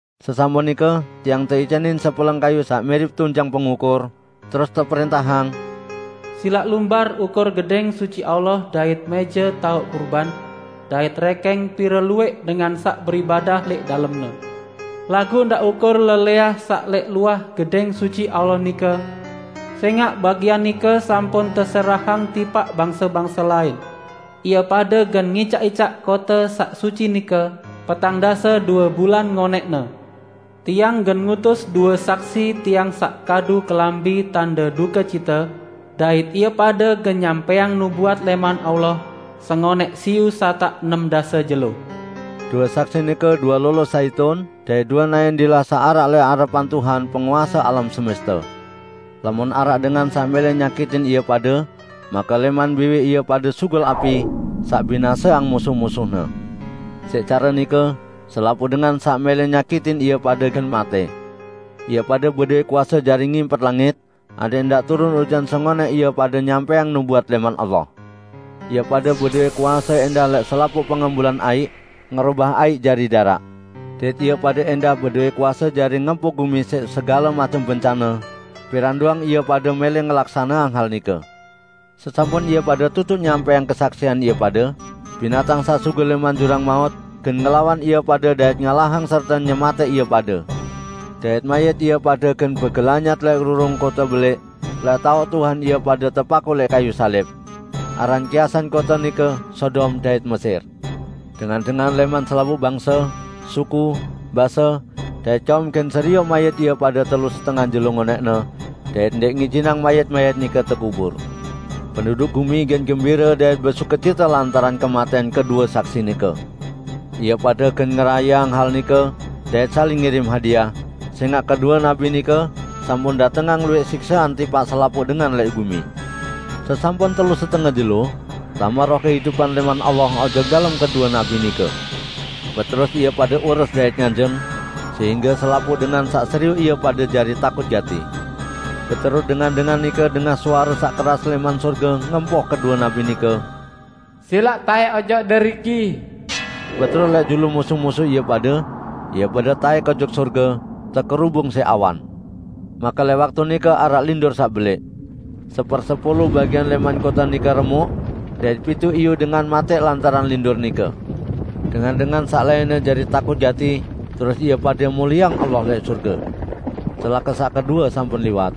Sesampun nike tiang teicanin sepeleng kayuq saq mirip tunjang pengukur, terus teprẽntahang, "Silaq lumbar ukur Gedẽng Suci Allah dait mẽje taoq kurban, dait rẽkẽng pire luwẽq dengan saq beribadah lẽq dalemne. Laguq ndaq ukur lelẽah saq lẽq luah Gedẽng Suci Allah nike, sẽngaq bagian nike sampun teserahang tipaq bangse-bangse lain. Ie pade gen ngicaq-icaq kote saq suci nike petang dase due bulan ngonẽqne. Tiang gen ngutus due saksi Tiang saq kadu kelambi tande dukecite, dait ie pade gen nyampẽang nubuat lẽman Allah sengonẽq siyu satak enem dase jelo." Due saksi nike due lolo zaitun dait due naẽn dilah saq araq lẽq arepan Tuhan penguase alam semeste. Lamun araq dengan saq mẽlẽ nyakitin ie pade, make lẽman biwih ie pade sugul api saq binaseang musuh-musuhne. Siq care nike, selapuq dengan saq mẽlẽ nyakitin ie pade gen matẽ. Ie pade bedowẽ kuase jari ngimpet langit adẽq ndaq turun ujan sengonẽq ie pade nyampẽang nubuat lẽman Allah. Ie pade bedowẽ kuase ẽndah lẽq selapuq pengembulan aiq, ngerobah aiq jari daraq. Dait ie pade ẽndah bedowẽ kuase jari ngempuk gumi siq segale macem bencane, piran doang ie pade mẽlẽ ngelaksaneang hal nike. Sesampun ie pade tutuq nyampẽang kesaksian ie pade, binatang saq sugul lẽman jurang maut gen ngelawan ie pade dait ngalahang serte nyematẽq ie pade. Dait mayit ie pade gen begelanyat lẽq rurung kote belẽq, lẽq taoq Tuhan ie pade tepakuq lẽq kayuq salib. Aran kiasan kote nike Sodom dait Mesir. Dengan-dengan lẽman selapuq bangse, suku, base, dait kaum gen serioq mayit ie pade telu setenge jelo ngonẽqne, dait ndẽq ngijinang mayit-mayit nike tekubur. Penduduk gumi gen gembire dait besukecite lantaran kematẽan kedue saksi nike. Ie pade gen ngerayeang hal nike dait saling ngirim hadiah, sẽngaq kedue nabi nike sampun datengang luwẽq siksean tipaq selapuq dengan lẽq gumi. Sesampun telu setenge jelo, tame roh kehidupan lẽman Allah ojok dalem kedue nabi nike. Beterus ie pade ures dait nganjeng, sehingge selapuq dengan saq serioq ie pade jari takut gati. Beterus dengan-dengan nike dengah suare saq keras lẽman sorge ngempoh kedue nabi nike, "Silaq taẽk ojok deriki!" Beterus lẽq julu musuh-musuh ie pade, ie pade taẽk ojok sorge, tekerubung siq awan. Make lẽq waktu nike araq lindur saq belẽq. Sepersepulu bagian lẽman kote nike remuk, dait pituq iyu dengan matẽ lantaran lindur nike. Dengan-dengan saq lainne jari takut gati, terus ie pade mulieang Allah lẽq sorge. Celake saq kedue sampun liwat.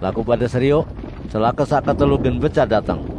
Laguq pade serioq! Celake saq ketelu gen becat dateng.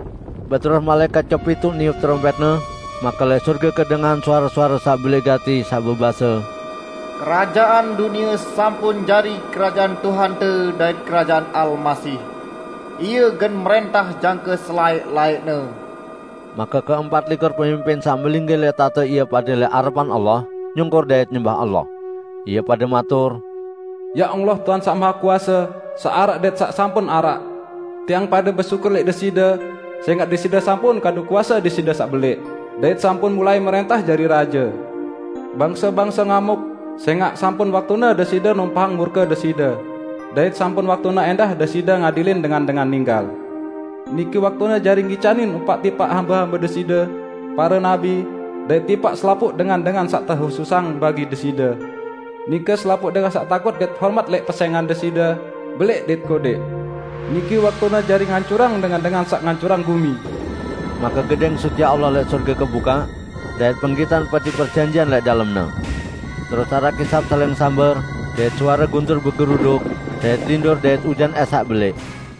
Beterus malaẽkat kepituq niup terompẽtne, make lẽq sorge kedengahan suare-suare saq belẽq gati saq bebase, "Kerajaan dunie sampun jari kerajaan Tuhante dait kerajaan Almasih. Ie gen mrẽntah jangke selaẽq-laẽqne." Make keempat likur pemimpin saq melinggih lẽq tahte ie pade lẽq arepan Allah, nyungkur dait nyembah Allah. Ie pade matur, "Ya Allah, Tuhan saq Mahekuase, saq araq, dait saq sampun araq! Tiang pade besyukur lẽq Deside sẽngaq Deside sampun kadu kuase Deside saq belẽq, dait sampun mulai mrẽntah jari raje! Bangse-bangse ngamuk sẽngaq sampun waktune Deside numpahang murke Deside, dait sampun waktune ẽndah Deside ngadilin dengan-dengan ninggal. Niki waktune jari ngicanin upaq tipaq hambe-hambe Deside, pare nabi, dait tipaq selapuq dengan-dengan saq tehususang bagi Deside, nike selapuq dengan saq takut dait hormat lẽq pesẽngan Deside, belẽq dait kodẽq. Niki waktune jari ngancurang dengan-dengan saq ngancurang gumi!" Make Gedẽng Suci Allah lẽq sorge kebukaq, dait penggitan Peti Perjanjian lẽq dalemne. Terus araq kisap saling samber dait suare guntur begeruduk, dait lindur dait ujan ẽs saq belẽq.